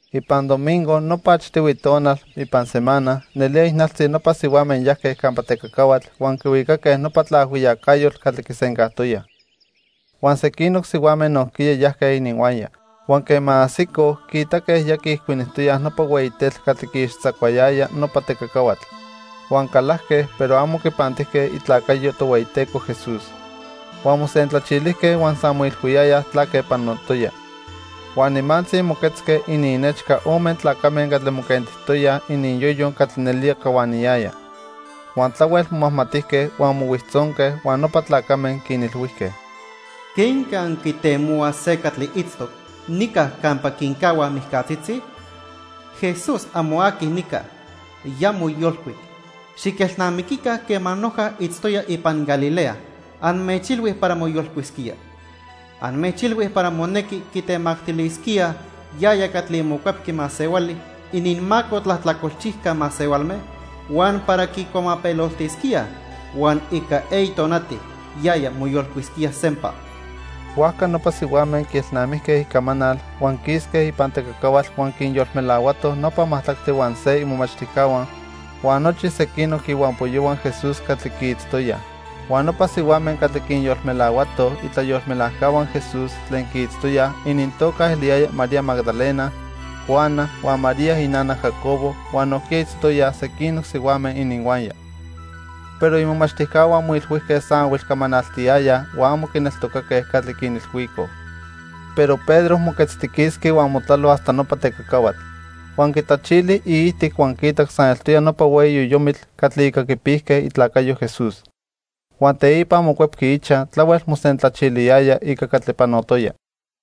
Ipan domingo, nopa achtihui tonal ipan semana, nelía ijnaltzi nopa sihuame yajque campa tecacahuatl huan quihuicaque nopa tlaajhuiyacayotl catli quisencajtoyaj. Huan sequinoc sihuame nojquiya yajque ininhuaya. Huan quema ajsicoj, quiitaque ya quiijcuinijtoyaj nopa hueyi tetl catli quiixtzacuayaya nopa tecacahuatl. Huan calajque, pero amo quipantijque itlacayo Tohueyiteco Jesús. Huan mosentlachilijque huan san moilhuiyayaj tlaque panotoya. Huan nimantzi moquetzque ininnechca ome tlacame catli moquentijtoyaj ininyoyo catli nelía cahuaniyaya. Huan tlahuel momajmatijque huan mohuijtzonque huan nopa tlacame quinilhuijque: —¿Quenque anquitemohuaj se catli itztoc nica campa quincahuaj mijcatzitzi? Jesús amo aqui nica. Ya moyolcuic. Xiquelnamiquica quema noja itztoya ipan Galilea anmechilhui para moyolcuisquía. Anmechilhui para monequi quitemactilisquíaj yaya catli Mocuepqui Masehuali ininmaco tlajtlacolchijca masehualme huan para quicuamapeloltisquíaj huan ica eyi tonati yaya moyolcuisquía sempa. Huajca nopa sihuame quielnamijque icamanal, huan quisque ipan tecacahuatl huan quinyolmelahuatoj nopa majtlactli huan se imomachtijcahua huan nochi sequinoc ihuampoyohua Jesús catli quiitztoyaj. Huan nopa sihuame catli quinyolmelahuatoj itlayolmelajcahua Jesús tlen quiitztoyaj inintoca eliyaya María Magdalena, Juana, huan María inana Jacobo huan nojquiya itztoyaj sequinoc sihuame ininhuaya. Pero imomachtijcahua moilhuijque san ahuilcamanaltiyayaj huan amo quineltocaque catli quinilhuicoj. Pero Pedro moquetztiquisqui huan motlalo hasta nopa tecacahuatl. Huan quitlachili iijtic huan quiitac san eltoya nopa hueyi yoyomitl catli ica quipijque itlacayo Jesús. Huan teipa mocuepqui ichaj tlahuel mosentlachiliyaya ica catli panotoya.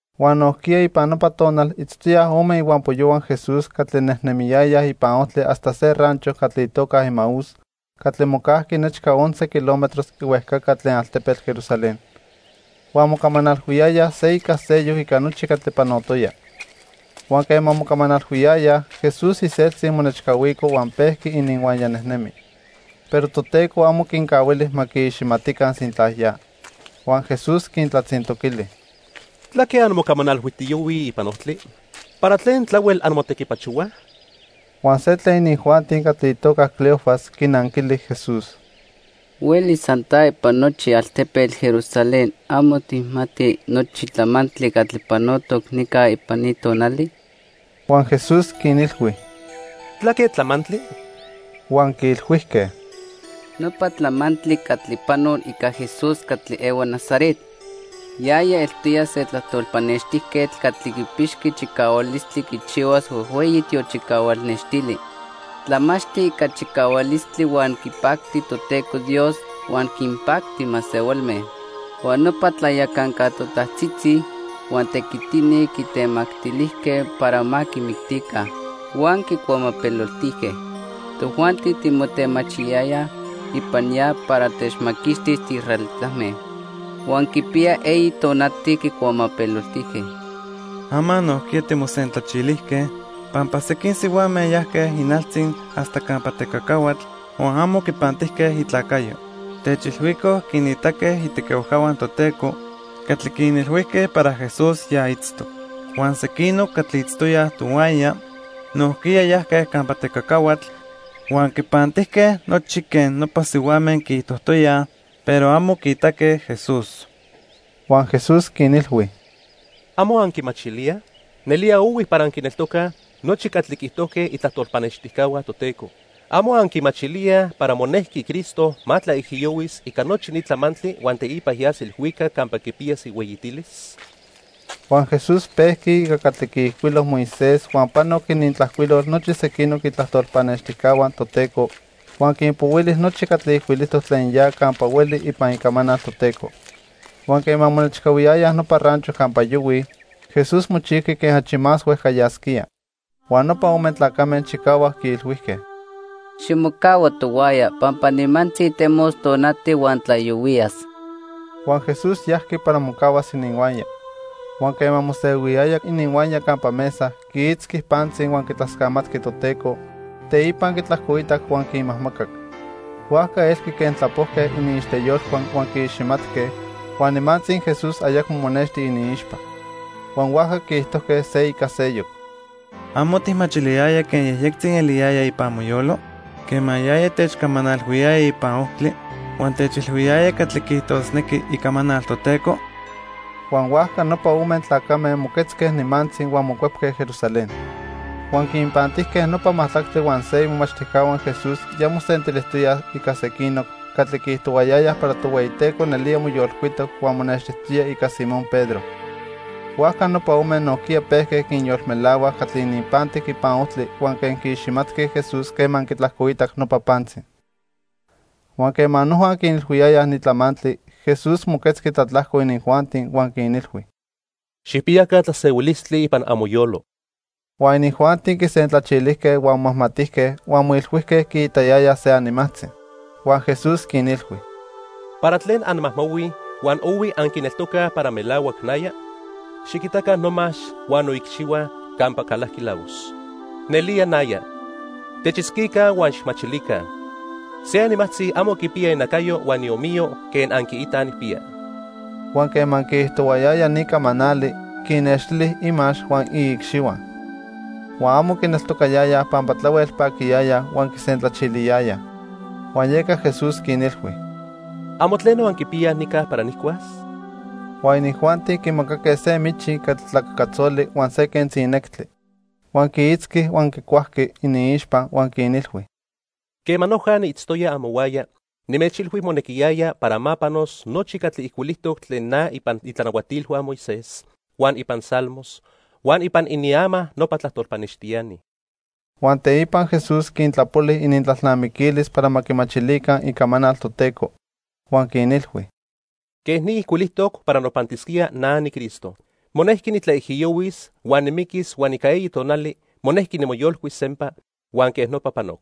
Huan nojquiya ipan nopa tonal itztoyaj ome ihuampoyohua Jesús catli nejnemiyayaj ipan ojtli hasta se rancho catli itoca Emaús catli mocajqui nechca once kilómetros ihuejcaca tlen altepetl Jerusalén. Huan mocamanalhuiyayaj se ica seyoc ica nochi catli panotoya. Huan quema mocamanalhuiyayaj, Jesús iseltzi monechcahuico huan pejqui ininhuaya nejnemi. Pero Toteco amo quincahuili ma quiiximatica sintla ya. Huan Jesús quintlatzintoquili: —¿Tlaque anmocamanalhuijtiyohuij ipan ojtli? ¿Para tlen tlahuel anmotequipachohuaj? Huan se tlen inijuanti catli itoca Cleofas quinanquili Jesús: —¿Huelis san ta ipan nochi altepetl Jerusalén amo tijmati nochi tlamantli catli panotoc nica ipan ni tonali? Huan Jesús quinilhui: —¿Tlaque tlamantli? Huan quiilhuijque: —Nopa tlamantli catli panoc ica Jesús catli ehua Nazaret. Yaya eltoya se tlajtol pannextijquetl catli quipixqui chicahualistli quichihuas huejhueyi tiochicahual nextili. Tlamachti ica chicahualistli huan quipacti Toteco Dios huan quinpacti masehualme. Huan nopa tlayacanca totajtzitzi huan tequitini quitemactilijque para ma quimictica. Huan quicuamapeloltijque. Tojuanti timotemachiyayayaj ipan ya para techmaquixtis tiisraelitame. Huan quipiya eyi tonati quicuamapeloltijque. Ama nojquiya timosentlachilijque pampa sequin sihuame yajque ijnaltzi hasta campa tecacahuatl, huan amo quipantijque itlacayo. Techilhuicoj quinitaque itequihuajcahua Toteco catli quinilhuijque para Jesús ya itztoc. Huan sequinoc catli itztoyaj tohuaya nojquiya yajque campa tecacahuatl huan quipantijque nochi quen nopa sihuame quiijtojtoyaj, pero amo quiitaque Jesús. Huan Jesús quinilhui: —¿Amo anquimachilíaj? Nelía ohui para anquineltocaj nochi catli quiijtojque itlajtol pannextijcahua Toteco. ¿Amo anquimachilíaj para monejqui Cristo ma tlaijiyohuis ica nochi ni tlamantli huan teipa yas ilhuicac campa quipiyas ihueyitilis? Huan Jesús pejqui ica catli quiijcuilo Moisés huan panoc inintlajcuilol nochi sequinoc itlajtol pannextijcahua Toteco, huan quinpohuili nochi catli ijcuilijtoc tlen ya campa hueli ipan Icamanal Toteco. Huan quema monechcahuiyayaj nopa rancho campa yohuij, Jesús mochijqui quen achi más huejca yasquía. Huan nopa ome tlacame chicahuac quiilhuijque: —Ximocahua tohuaya pampa nimantzi temos tonati huan tlayohuiyas. Huan Jesús yajqui para mocahuas ininhuaya. Huan quema mosehuiyaya ininhuaya campa mesa, quiitzqui pantzi huan quitlascamatqui Toteco, teipa quitlajcoitac huan quinmajmacac. Huajca elqui quen tlapojque iniixteyolhua huan quiiximatque, huan nimantzi Jesús ayacmo monexti iniixpa. Huan huajca quiijtojque se ica seyoc: —¿Amo tijmachiliyaya quen yejyectzi eliyaya ipan moyolo quema yaya techcamanalhuiyaya ipan ojtli huan techilhuiyaya catli quiijtosnequi Icamanal Toteco? Huan huajca nopa ome tlacame moquetzque nimantzi huan mocuepque Jerusalén. Huan quinpantijque nopa majtlactli huan se imomachtijcahua Jesús ya mosentilijtoyaj ica sequinoc catli quiijtohuayayaj para Tohueyiteco nelía moyolcuitoc huan monextijtoya ica Simón Pedro. Huajca nopa ome nojquiya pejque quinyolmelahuaj catli ininpantic ipan ojtli huan quen quiiximatque Jesús quema quitlajcoitac nopa pantzi. Huan quema noja quinilhuiyayaj ni tlamantli, Jesús moquetzqui tlatlajco inijuanti huan quinilhui: —Xijpiyaca tlasehuilistli ipan amoyolo. Huan inijuanti quisentlachilijque huan momajmatijque huan moilhuijque quiitayayaj se animajtzi. Huan Jesús quinilhui: —¿Para tlen anmajmahuij huan ohui anquineltocaj para melahuac naya? Xiquitaca nomax huan noicxihua campa calajqui lavos. Nelía naya. Techitzquica huan xijmachilica. Se animajtzi amo quipiya inacayo huan iomiyo quen anquiitaj nijpiya. Huan quema quiijtohuayaya ni camanali, quinnextili imax huan iicxihua. Huan amo quineltocayayaj pampa tlahuel paquiyayaj huan quisentlachiliyayaj. Huan yeca Jesús quinilhui: —¿Amo tleno anquipiyaj nica para nijcuas? Huan inijuanti quimacaque se michi catli tlacacatzoli huan se quentzi nectli. Huan quiitzqui huan quicuajqui iniixpa. Huan quinilhui: —Quema noja niitztoya amohuaya, nimechilhui monequiyaya para ma panos nochi catli ijcuilijtoc tlen na ipan itlanahuatilhua Moisés, huan ipan Salmos, huan ipan iniama nopa tlajtol pannextiani. Huan teipa Jesús quintlapoli inintlalnamiquilis para ma quimachilica Icamanal Toteco. Huan quinilhui: —Quej ni ijcuilijtoc para nopantisquía na niCristo. Monejqui nitlaijiyohuis huan nimiquis huan ica eyi tonali monejqui nimoyolcuis sempa; huan quej nopa panoc.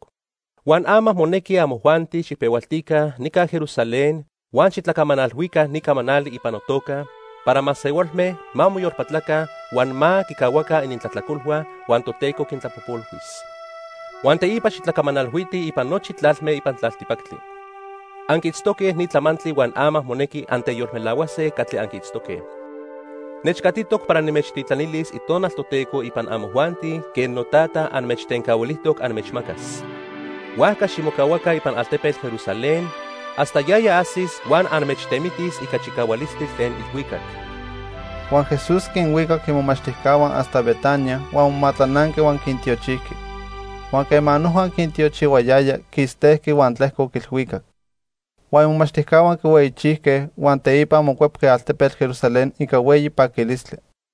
Huan ama monequi amojuanti xijpehualtica nica Jerusalén huan xitlacamanalhuica ni camanali ipan notoca para masehualme ma moyolpatlaca huan ma quicahuaca inintlajtlacolhua huan Toteco quintlapojpolhuis. Huan teipa xitlacamanalhuitij ipan nochi tlalme ipan tlaltipactli. Anquiitztoque ni tlamantli huan ama monequi anteyolmelahuase catli anquiitztoque. Nechcatitoc para nimechtitlanilis Itonal Toteco ipan amojuanti quen noTata anmechtencahuilijtoc anmechmacas. Huajca ximocahuaca ipan altepetl Jerusalén hasta yaya ajsis huan anmechtemitis ica chicahualistli tlen ilhuicac. Huan Jesús quinhuicac imomachtijcahua hasta Betania huan momatlananqui huan quintiochijqui. Huan quema noja quintiochihuayaya, quistejqui huan tlejcoc ilhuicac. Huan imomachtijcahua quihueyichijque, huan teipa mocuepque altepetl Jerusalén ica hueyi paquilistli.